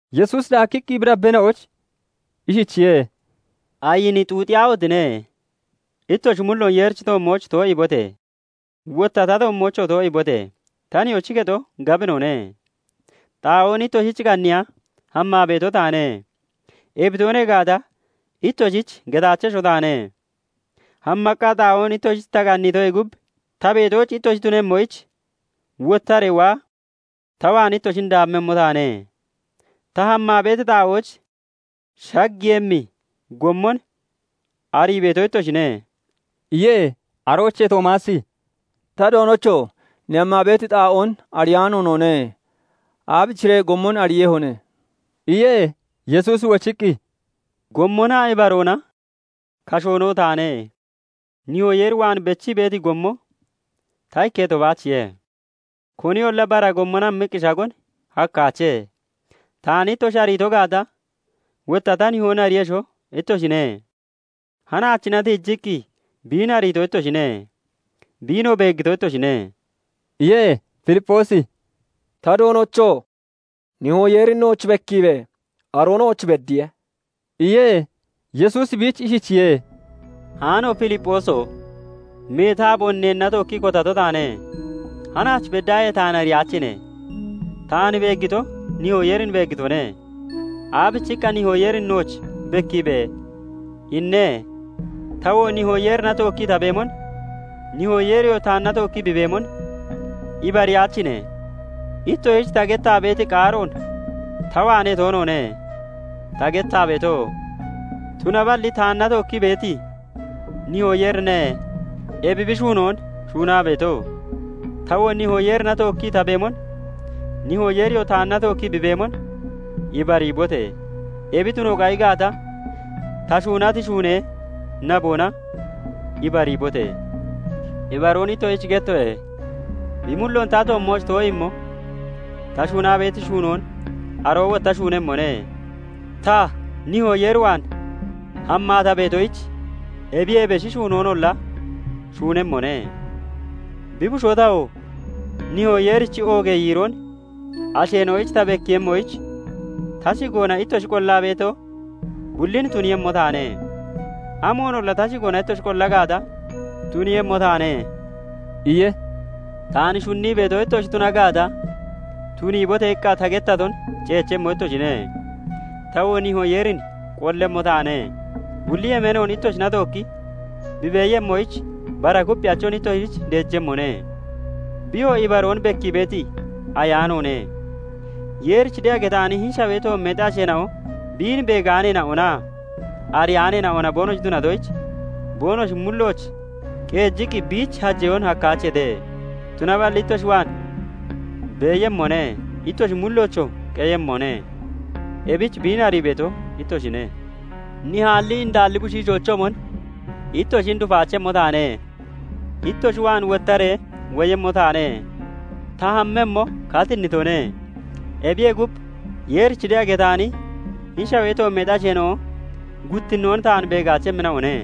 Yesuusi daakkiqqi bi dabbeena'oyich ishichiye:- "Ayini xuuxiyaahotine! Ittoshi mulloon Yeerichi toommooch too'iibote! Wotta ta toommoochoo too'iibote! Ta Nihoochi kexo gabinone; xaa'oon ittoshich qanniiya hammaa beeto taane. Ebi toonee gaata, ittoshich getaachesho taane. Hammaqqa xaa'oon ittoshich ta qanniitoyee gub, ta beetooch ittoshi tunemmoyich wottaree waa ta waan ittoshin daammemmo taane. Ta hammaa beeti xaa'ooch shaggiiyemmi gommon arii beeto ittoshine" iye. Aroochee Toomaasi "Ta Doonocho! Ne hammaa beeti xaa'oon ariyaano noone; aabichiree gommon ariiyehone?" iye. Yesuusi wochiqqi, "Gommonaa ibaroona, kashoonoo taane; Nihoo Yeer waan bechii beeti gommo ta ikketo baachiye; koniyolla bara gommona hammiqqi shagon hakkaache. Taan ittoshi ariito gaata, wotta ta Nihoon ariiyesho ittoshine. Hanaachina tiijiqqi biin ariito ittoshine; biinoo beeggito ittoshine" iye. Filipphoosi "Ta Doonocho! Nihoo Yeerin nooch bekkiibe! Aroo nooch beddiye" iye. Yesuusi biich ishichiye:- "Haano Filipphooso! Meeti aaboon neenna tookkii kotato taane; hanaach beddaahee taan ariyaachine? Taan beeggito Nihoo Yeerin beeggitone. Aabichiqqa, 'Nihoo Yeerin nooch bekkiibe!' inne? Tawoo Nihoo Yeerina tookkii ta beemon, Nihoo Yeeriyoo taanna tookkii bi beemon ibariyaachine? Ittoshich ta gettaa beeti qaaroon ta waanee toonoone ta gettaa beeto; tunaballi taanna tookkii beeti Nihoo Yeerine ebi bi shuunoon shuunaa beeto. Tawoo Nihoo Yeerina tookkii ta beemon, Nihoo Yeeriyoo taanna tookkii bi beemon ibariibote! Ebi tuno qayi gaata, ta shuunati shuunee naboona ibariibote! Ibaroon ittoshich gettoye:- Bi mulloon ta toommooch too'iimmo ta shuunaa beeti shuunoon aroo wotta shuunemmone; ta, Nihoo Yeer waan hammaa ta beetoyich ebiyee beshi shuunoonolla shuunemmone. Bi Bushoo tawo, Nihoo Yeerichi oogee yiiroon asheena'oyich ta bekkiiyemmoyich, ta shigoona ittoshi qollaa beeto bullin tuniiyemmo taane. Amoonolla ta shigoona ittoshi qolla gaata, tuniiyemmo taane" iye. "Taan shunnii beeto ittoshi tuna gaata, 'Tuniibote!' iqqa ta gettaton ceechemmo ittoshine. Tawoo Nihoo Yeerin qollemmo taane; bulli yemeenoon ittoshina tookki bi beeyemmoyich, bara Kupphiyachon ittoshich deejemmone. Biyoo ibaroon bekkii beeti Ayaanoone; Yeerich de'a getaani hini shawee toommeexi asheena'o biin beegaaneena'onaa ariyaaneena'ona boonoshi tunatoyich, boonoshi mullooch qeejiqqi biich hajeyoon hakkaacheete; tunaballi ittoshi waan beeyemmone; ittoshi mulloochoo qeyemmone; ebich biin arii beeto ittoshine. Nihaalli indaalli bushiishoochoomon ittoshin dufaachemmo taane; ittoshi waan wottaree woyemmo taane. Ta hammemmo katinnitone; ebiyee gub, Yeerich de'a getaani hini shawee toommeexi asheena'o guttinnoon taan beegaachemmina'one;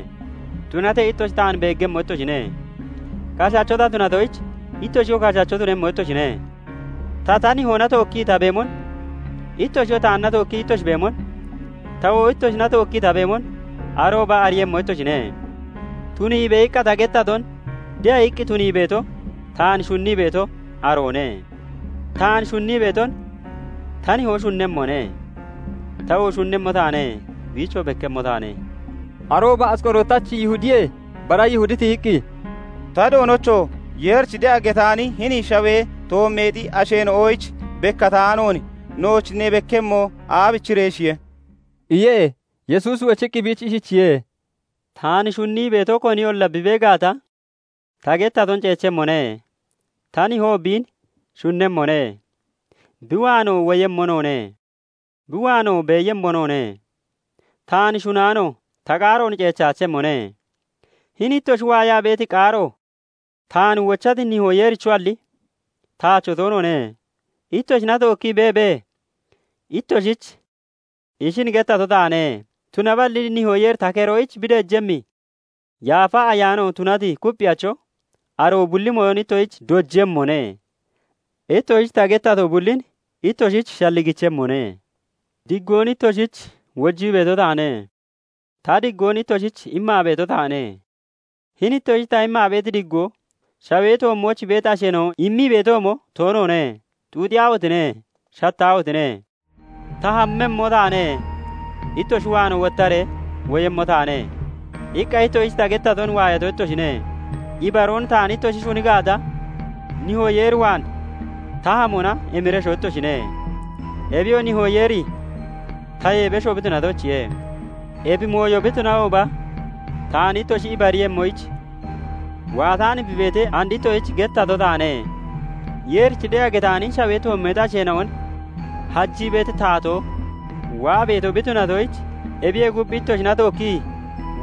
tunatee ittoshi taan beeggemmo ittoshine. Kashacho ta tunatoyich, ittoshiyoo kashacho tunemmo ittoshine. Ta, ta Nihoona tookkii ta beemon, ittoshiyoo taanna tookkii ittoshi beemon, tawoo ittoshina tookkii ta beemon arooba ariiyemmo ittoshine. 'Tuniibe!' iqqa ta gettaton de'a iqqi tunii beeto, taan shunnii beeto aroone; taan shunnii beeton ta Nihoo shunnemmone; tawoo shunnemmo taane; biichoo bekkemmo taane" iye. Arooba Asqorootachi Yihudiyee bara Yihudi tiyiqqi, "Ta Doonocho! Yeerich de'a getaani hini shawee toommeexi asheena'oyich bekkataanoon nooch ne bekkemmo aabichireeshiye?" iye. Yesuusi wochiqqi biich ishichiye:- "Taan shunnii beeto koniyolla bi bee gaata, ta gettaton ceechemmone; ta Nihoo biin shunnemmone; bi waanoo woyemmo noone; bi waanoo beeyemmo noone. Taan shunnaano ta qaaroon ceechaachemmone. Hini ittoshi waayaa beeti qaaro taan wochati Nihoo Yeerichoalli, taacho toonoone. "Ittoshina tookkii beebee, ittoshich ishin gettato taane. Tunaballi Nihoo Yeeri ta keroyich bi deejemmi Yaafa Ayaano tunati Kupphiyacho, aroo bulli mooyon ittoshich dojemmone; ittoshich ta gettato bullin ittoshich shalligichemmone. Diggoon ittoshich wojii beeto taane; ta diggoon ittoshich immaa beeto taane. Hini ittoshich ta immaa beeti diggoo, shawee toommooch beeti asheena'o immii beetoomo toonoone. Xuuxiyaahotine! Shattaahotine! " 'Ta hammemmo taane; ittoshi waanoo wottaree woyemmo taane' iqqa ittoshich ta gettaton waayato ittoshine. Ibaroon taan ittoshi shuni gaata, Nihoo Yeer waan ta hamona emiresho ittoshine; Ebiyoo Nihoo Yeeri tayee besho bi tunatoyichiye. Ebi mooyo bi tunahooba taan ittoshi ibariiyemmoyich, waataan bi beetee, and ittoshich gettato taane. Yeerich de'a getaani hini shawee toommeexi asheena'on hajii beeti taatoo waa beeto bi tunatoyich, ebiyee gub, ittoshina tookkii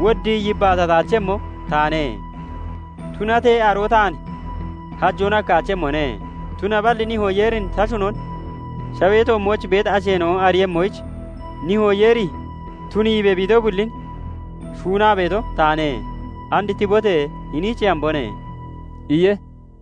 woddii yibbaatataachemmo taane. Tunatee aroo taan hajoon hakkaachemmone; Tunaballi Nihoo Yeerin ta shunon shawee toommooch beeti asheena'o ariiyemmoyich, Nihoo Yeeri 'Tuniibe!' bi ito bullin shuunaa beeto taane. And tibote! Hiniichee hambone" iye.